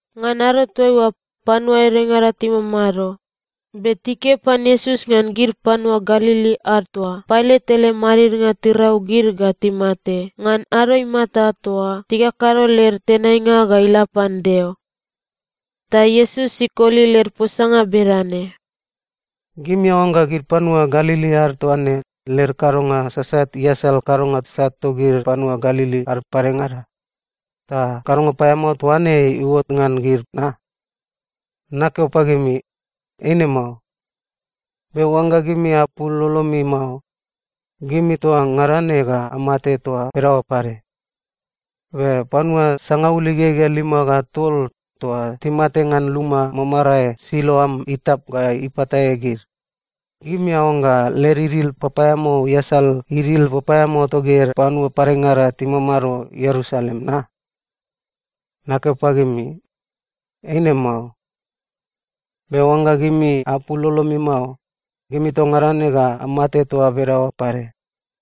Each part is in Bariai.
Ngan ado toaiua, panua edengada timamado be tikeo pan Iesus ngan gid panua Galili ad toa Pailat ele madidnga tirau gid ga timate ngan ado imata toa tikakado led tenainga ga ila pan Deo. Ta Iesus ikoli led posanga bedane, “Gimi aoangga gid panua Galili ad toa ne led kadonga sasat iasal kadonga sat togid panua Galili ad padengada, ta kadonga paeamao toa ne iuot ngan gid na? Nakeo pagimi, eine mao. Be oangga gimi apul lolomi mao, gimi toa ngada ne ga amate toa bedaoa pade. Be panua sangaul igegea lima ga tol toa timate ngan luma mamarae Siloam itap ga ipatae gid, gimi aoangga led idil papaeamao iasal idil papaeamao togid panua padengada timamado Ierusalem na? Nakeo pagimi, eine mao. Be oangga gimi apul lolomi mao, gimi toa ngada ne ga amate toa bedaoa pade.”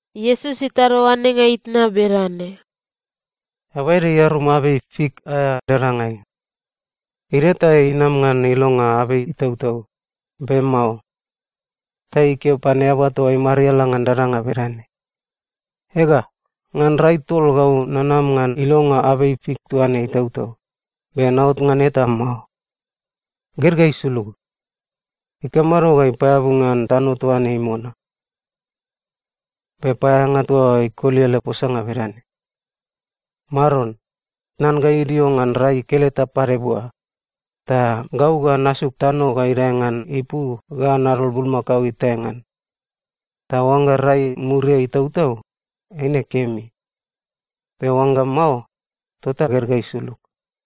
Iesus itado oanenga itna bedane, “Eaba ede iarum abei fik aea dadangai. Idio ta inam ngan ilonga abei itautau, be mao. Ta ikeo pan eaba toa imariala ngan dadanga bedane, ‘Ega, ngan rai tol gau nanam ngan ilonga abei fik toa ne itautau, be naot ngan eta mao. Ged ga isulug. Ikamado ga ipaeabu ngan tano toa ne imona?’ “Be paeaeanga toa oa ikoli ele posanga bedane, ‘Maron, tnan ga idio ngan rai keleta pade bua, ta gau ga nasuk tano ga idae ngan ipu ga nadol bulmakao itae ngan. Ta oangga rai muriai itautau, eine kemi. Be oangga mao, tota ged ga isulug.’”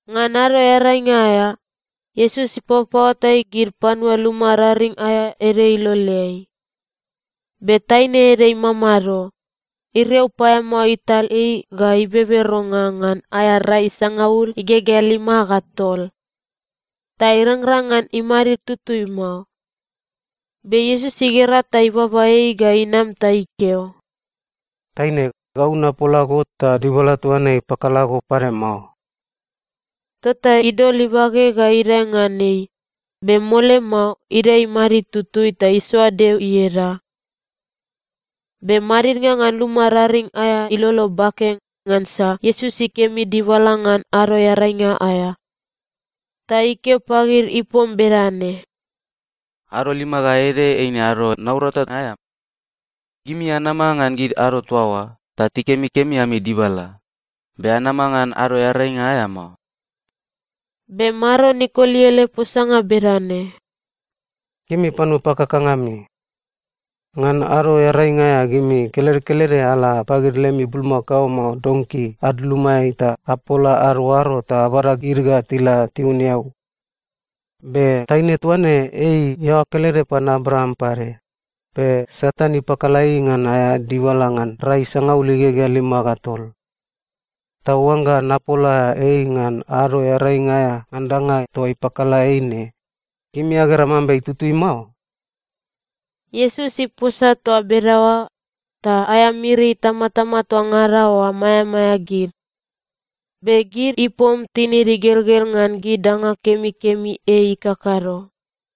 Ngan Ado Earainga aea, Iesus ipapaoatai gid panua luma raring aea ede iloleai. Be taine ede imamado. Iriau paeamao ital ei ga ibeberonga ngan aea rai sangaul igegea lima ga tol. Ta irangrang ngan imadid tutui mao. Be Iesus igera ta ibaba ei ga inam ta ikeo, “Taine, gau napola go ta dibala toa ne ipakala go pade mao.” Tota idol ibage ga idae ngan ei, be mole mao idae imadid tutui ta isoa Deo ieda. Be madidnga ngan luma raring aea ilolo bake, ngansa Iesus ikemi dibala ngan Ado Earainga aea. Ta ikeo pagid ipom bedane, “Ado lima ga ede eine ado naurata aea. Gimi anama ngan gid ado toa oa, ta tikemikemi ami dibala, be anama ngan Ado Earainga aea mao.” Be Maron ikoli ele posanga bedane, “Gimi panua pakakanga ami! Ngan Ado Earainga aea gimi kelede kelede ala pagid lemi bulmakao mao donki ad lumaeai ta apola ad oaro ta abada gid ga tila tiun eau. Be taine toa ne ei iaoa kelede pan Abraam pade, be Satan ipakala ei ngan aea dibala ngan rai sangaul igegea lima ga tol. Ta oangga napola ei ngan Ado Earainga aea ngan danga toa ipakala ei ne, gimi agera mambe itutui mao?” Iesus iposa toa bedaoa, ta aea miri itamatama toa ngada oa maeamaea gid. Be gid ipom tinid igelgel ngan gid danga kemikemi ei ikakado.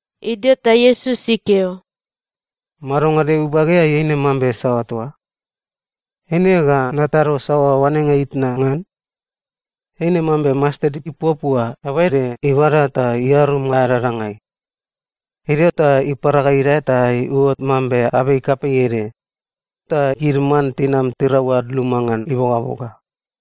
Idio ta Iesus ikeo, “Madonga Deo ibageai eine mambe saoa toa? Eine ga natado saoa oanenga itna ngan? Eine mambe mastet ipuapua eaba ede ibada ta iarum aea dadangai. Idio ta ipara ga idae ta iuot mambe abei kapei ede, ta gid man tinam tirau ad luma ngan ibogaboga.”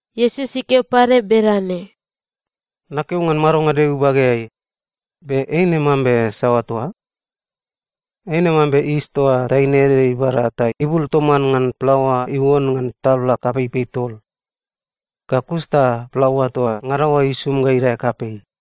Iesus ikeo pade bedane, “Nakeo ngan madonga Deo ibageai, be eine mambe saoa toa? Eine mambe yis toa taine ede ibada ta ibul toman plaoa iuon ngan tabla kapeipei tol. Ga kus ta plaoa toa ngada oa isum ga idae kapei.”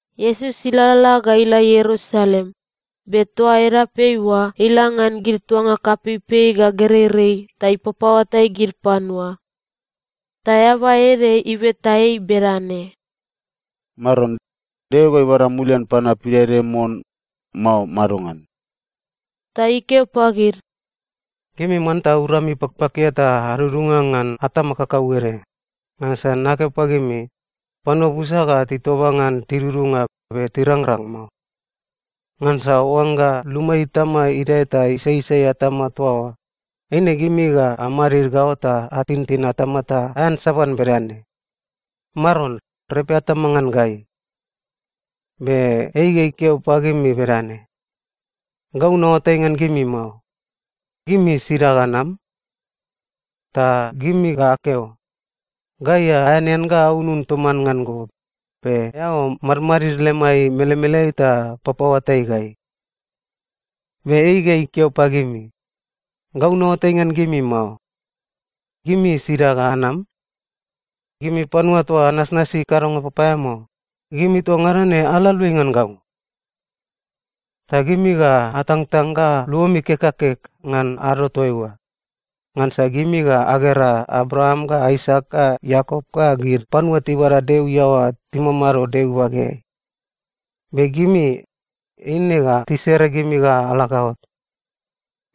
Iesus ilalala ga ila Ierusalem, be toa edapeai oa ila ngan gid tuanga kapeipei ga gereirei ta ipapaoatai gid panua. Ta eaba ede ibeta ei bedane, “Maron, Deo ga ibada mulian panua pidaede mon, mao madongan?” Ta ikeo pagid, “Gimi manta urami pakpakia ta adudunga ngan atama kakauede, ngansa nakeo pagimi, panua busa ga titoba ngan tidudunga, be tirangrang mao. Ngansa oangga luma itama idae ta isaisai atama toa oa, eine gimi ga amadid gaot ta atintin atama ta aeansaban bedane, ‘Maron, repe atama ngan gai.’ “Be ei ga ikeo pagimi bedane, ‘Gau naoatai ngan gimi mao. Gimi sida ga anam?’ “Ta gimi ga akeo, ‘Gai aeanean ga aunun toman ngan go, be eao madmadid lemai melemeleai ta papaoatai gai.’ “Be ei ga ikeo pagimi, ‘Gau naoatai ngan gimi mao. Gimi sida ga anam? Gimi panua toa anasnasi kadonga papaeamao, gimi toa ngada ne ala aluai ngan gau!’ “Ta gimi ga atangtang ga luomi kek ga kek ngan ado toaiua, ngansa gimi ga agera Abraam ga Aisak ga Iakop ga gid panua tibada Deo iaoa timamado Deo ibageai. Be gimi, eine ga tisere gimi ga ala gaot.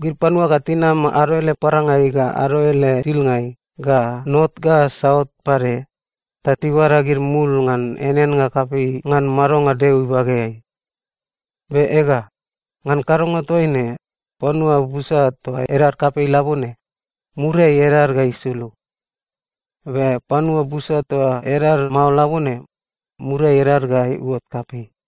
Gid panua ga tinam ado ele parangai ga ado ele dilngai ga not ga saut pade, ta tibada gid mul ngan eaneannga kapei ngan madonga Deo ibageai. Be ega, ngan kadonga toaine, panua busa toa edad kapei labone, muriai edad ga isulug. Be panua busa toa edad mao labone, muriai edad ga iuot kapei.”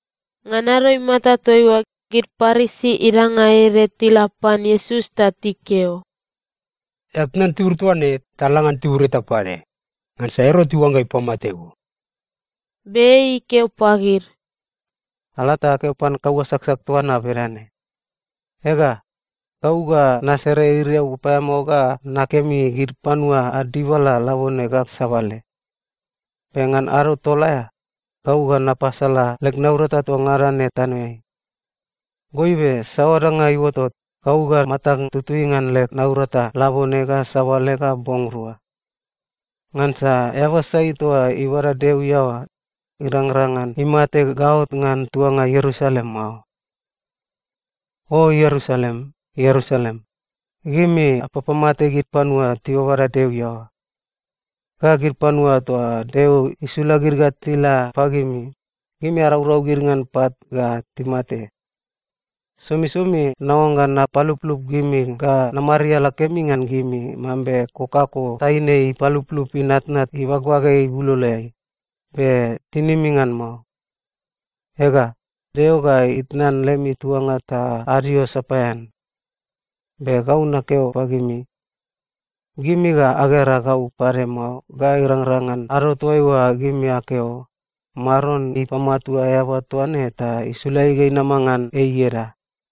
Ngan ado imata toaiua, gid Parisi idanga ede tila pan Iesus ta tikeo, “Eao tnan tibur toa ne, ta la ngan tibur eta pade, ngansa Erot iuangga ipamate go.” Be ei ikeo pagid, “Ala ta akeo pan kaua saksak toa na bedane: Ega, gau ga nasere iriau papaeamao ga nakemi gid panua ad dibala labone ga sabale. Be ngan ado tol aea, gau ga napasala leg naurata toa ngada ne tanoeai. Goibe saoa danga iuotot, gau ga matag tutui ngan leg naurata labone ga sabale ga bong rua. Ngansa eaba sai toa ibada Deo iaoa, irangrang ngan imate gaot ngan tuanga Ierusalem mao. “O Ierusalem, Ierusalem, gimi apapamate gid panua tibada Deo iaoa. Ga gid panua toa Deo isula gid ga tila pagimi, gimi araurau gid ngan pat ga timate. Somisomi naoangga napaluplup gimi ga namariala kemi ngan gimi mambe kokako taine ipaluplup inatnat ibagbage ibuloloeai, be tinimi ngan mao. Ega, Deo ga itnan lemi tuanga ta adio sapaean. Be gau nakeo pagimi, gimi ga agera gau pade mao ga ila irangrang ngan ado toaiua gimi akeo, ‘Maron ipamatua eaba toa ne ta isula ei ga inama ngan ei ieda.’”